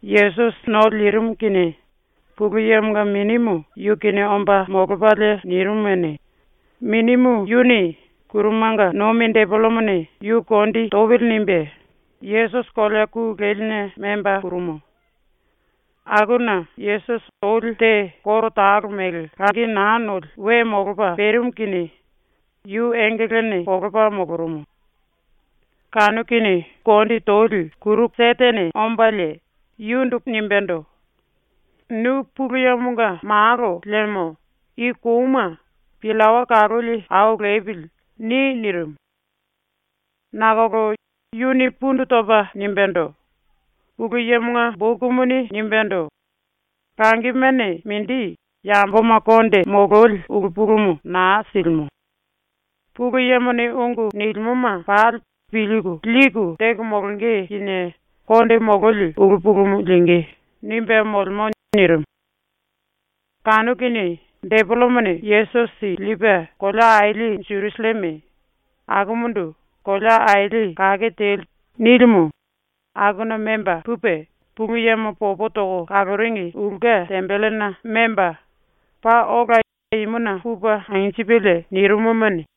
Yesusi ⸤no lirimu kinie Pulu Yemonga Minimu yu kinie omba molopalie nirimumuni,⸥ Minimu yuni ‘⸤Kurumanga nomi⸥ depelemone yu kondi topili.’ nimbe Yesusi kolea ku leline memba purumu. Akuna Yesusi oli te koro talo mele langi naa noli we molopa perimu kinie yu engelene kolopa molorumu. Kanu kinie ⸤kuru⸥ kondi toli ⸤Setene⸥ ombalie yundu nimbendo: “Nu Pulu Yemonga Malo liemo i kouma ‘Pillawa kaloli au lepili.’ ni.” nirimu. Nakolo yuni pundu topa nimbendo: “Pulu Yemonga bokumuni nimbendo: ‘Langimene mindi yamboma konde mololi ulu pulumu naa silimo. Pulu Yemone ungu nilimoma pali pilku liku teko molonge kinie konde mololi ulu pulumu lingí.’ nimbe molemo.” nirimu. Kanu kinie depelemone Yesusi lipe kolea aili Jerusalleme, akumundu ‘kolea aili kake teli’ nilimu, akuna memba pupe Pulu Yemo popo toko kaloringi ulke tembelena memba, paa ola imuna pupe anjipelie nirimumuni,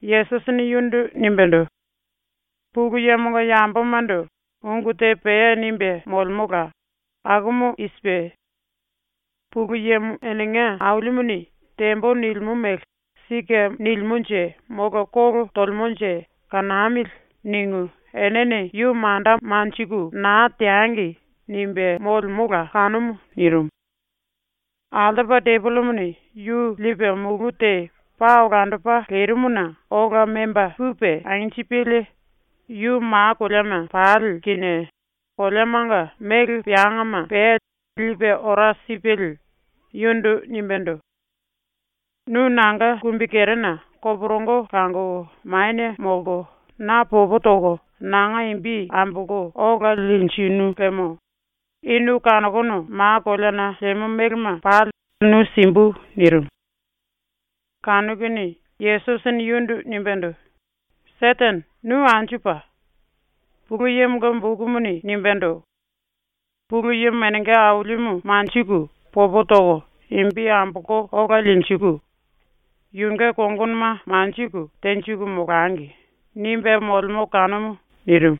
Yesusini yundu nimbendo: “Pulu Yemonga yambomando ungu te pea nimbe molemola. Akumu i sipe: ‘Pulu Yemo enenga Ailimuni “Tembo.” nilimo mele ‘Sike nilimonje molo kolo tolemonje kanamili.’ ningu enene yu manda manjiku na teangi.’ nimbe molemola kanumu.” nirimu. Altopa depelemone yu lipe mulu te paa olandopa lerimuna ola memba pupe anjipelie, yu ma koleama pali kinie koleamanga mele peangama pea lipe ora sipelie yundu nimbendo: “Nu nanga kumbikerena koporongo langoko manie molko na popo toko nanga imbi ambolko ola linjinu liemo i nu kanokono ma koleana lemo melema pali nu simbu.” nirimu. Kanu kinie Yesusini yundu nimbendo: “Setene, nu anju pa! Pulu Yemonga bokumuni nimbendo: ‘Pulu Yemo enenga Ailimu manjiku popo toko imbi ambolko ola linjiku, yunge kongonoma manjiku tenjiku molangi.’ nimbe molemo kanumu.” nirimu.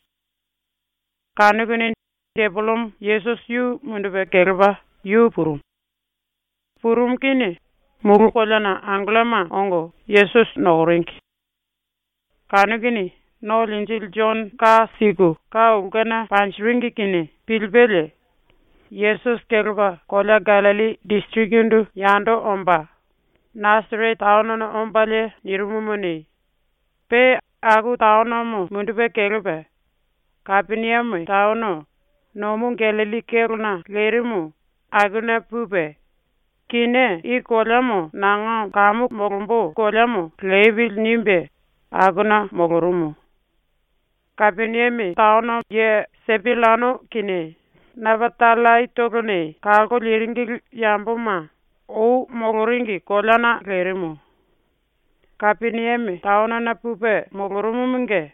Kanu kinie depelemo Yesusi yu mundupe kelepa yu purumu. Purumu kinie mulu koleana angelloma ongo Yesusi nokoringi. Kanu kinie ⸤No Linjili⸥ Jono ka siku ka ulkena panjiringi kinie pilipelie Yesusi kelepa kolea Gallilli disirikindu yando omba Nasarete taonona ombalie nirimumuni, pe aku taonomo mundupe kelepa Kapeniame taono, nomu Gallilli kélona lerimu, akuna pupe ‘Kinié i koleamo nanga molombo kamu koleamo lepili.’ nimbe akuna molorumu. Kapeniame ye Sepullano kinie Napatallaitolone kalko liringili yamboma ou moloringi koleana lerimu. ⸤Kapeniame taonona pupe molorumumunge⸥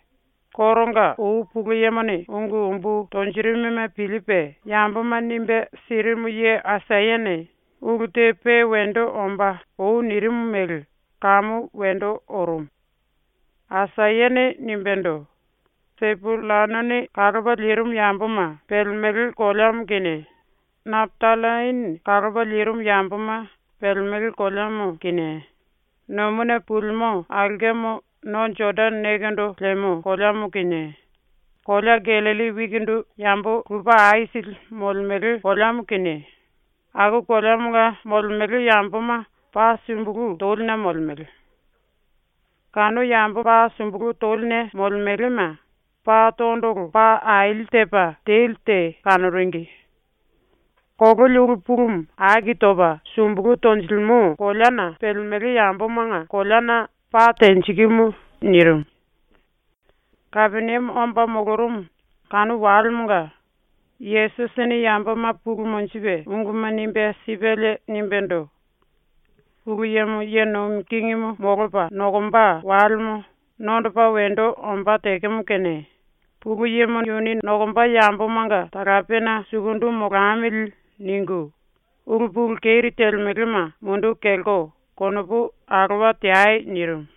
koronga ou Pulu Yemone ungu umbu tonjirimuma pilipe yamboma nimbe sirimu ye Aisayane ulu te pe wendo ombá ou nirimu mele kamu wendo orumu. Aisayane nimbendo: “Sepullanone kalopa lirimu yamboma pelemele koleamo kinie, Napatallaine kalopa lirimu yamboma pelemele koleamo kinie, nomuna pulimo aulkemo no Jodane nekendo lemo koleamo kinie, kolea Gallilli wikindu yambo lupe aisili molemele koleamo kinie, aku koleamanga molemele yamboma ⸤paa sumbulu toline molemele⸥. Kanu yambo paa sumbulu toline molemelema pa tondolo paa aili tepa teli te kanoringi. Kololi ulu pulumu aki topa sumbulu tonjilimo koleana pelemele yambomanga koleana pa tenjikimu.” nirimu. ⸤Kapeniame omba molorumu⸥ kanu walemonga Yesusini yamboma pulu monjipe unguma nimbe sipelie nimbendo: “Pulu Yemo ye nomi kingimu molopa nokomba walemo nondopa wendo ombá tekemo kene ⸤‘Pulu Yemo yuni nokomba yambomanga talapena sukundu molamili.’ ningu⸥ ulu pulu keri telemelema munduku kelko konopu alowa teai.” nirimu.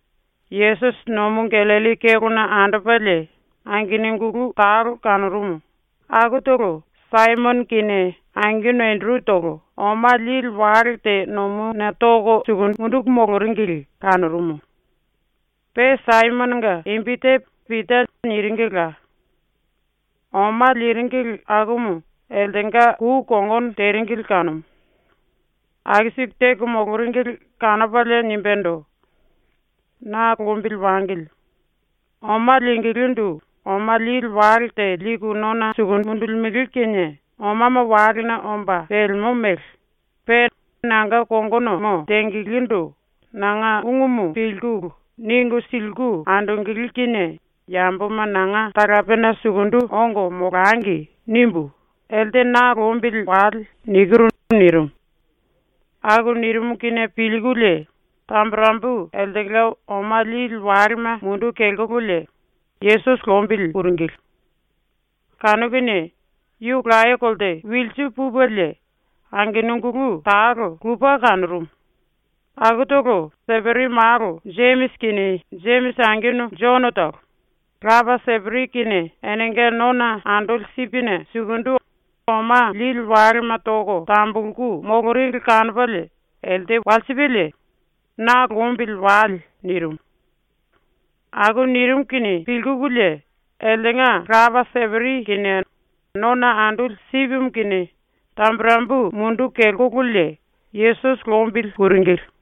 Yesusi Nomu Gallilli kélona andopalie angenungulu talo kanorumu, akutolo Saimono kinie angenu Enderutolo oma lili wale te nomuna toko munduku moloringili kanorumu. Pe Saimononga imbi te Pita niringila. Oma liringili akumu eltenga kou kongono teringili kanumu. Aku siku teko moloringili kanopalie nimbendo: “Na lombili wangili. Oma lingilindu oma lili wale te liku nona manie mundulimbele kinie omama walena omba pelemo mele, pe ‘nanga kongonomo tengelendo nanga ungumu pilkulu ningu siliku andongele kinie yamboma nanga talapena sukundu ongo molangi.’ nimbu ‘Elte na lombili wale.’ nikiru.” nirimu. Aku nirimu kinie pilkululie tamburembu eltenga oma lili walema munduku kelkololie Yesusi lombili puringili. Kanu kinie yu laye kolte wilsu pupelie angenungulu talo lupe kanorumu, akutolo Seperi malo Jemisi kinie Jemisi angenu Jonotolo, lapa Seperi kinie enenga nona andoli sipine sukundu oma lili walema toko tambulku moloringi kanopalie elte walsipelie “Na lombili wale.” nirimu. Aku nirimu kinie pilkululie eltenga lapa Seperi kinie nona andoli sipimu kinie tamburembu munduku kelkololie Yesusi lombili puringili.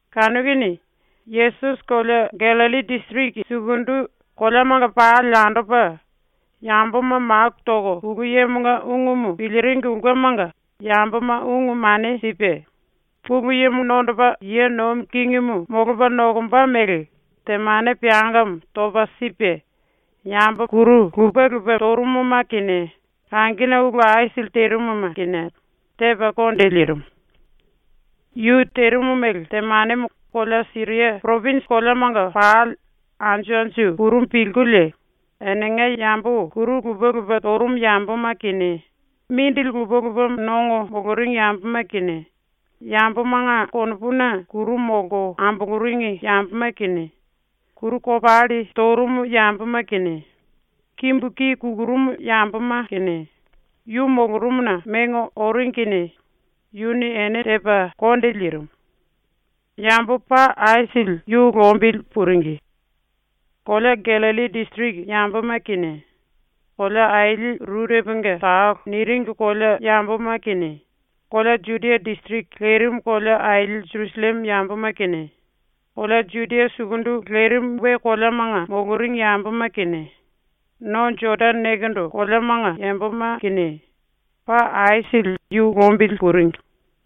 Kanu kinie Yesusi kolea Gallilli disiriki sukundu koleamanga pali andopa, yamboma maku toko Pulu Yemonga ungumu piliringi ulkemanga yamboma ungu mane sipe, Pulu Yemo nondopa ye nomi kingimu molopa nokomba mele temane peangamo topa sipe, yambo kuru lupe lupe torumuma kinie kangine ulu aisili terimuma kinie tepa konde lirimu. Yu terimu mele temanemo kolea Siria poropinji koleamanga pali anju anju purumu pilkulie enenga yambo kuru lupe lupe torumu yamboma kinie, mindili lupe lupe nongo moloringi yamboma kinie, yambomanga konopuna kuru molko amboloringi yamboma kinie, kuru kopalli torumu yamboma kinie, kimbu ki kukurumu yamboma kinie, yu molorumuna mengo oringi kinie yuni ene tepa konde lirimu. Yambo paa aisili yu lombili puringi. Kolea Gallilli disiriki yamboma kinie, ‘Kolea Aili Rureponga Talo’ niringi kolea yamboma kinie, kolea Judia disiriki lerimu kolea aili Jerusalleme yamboma kinie, kolea Judia sukundu lerimu we koleamanga moloringi yamboma kinie, no Jodane nekendo koleamanga yamboma kinie, paa aisili yu lombili puringi.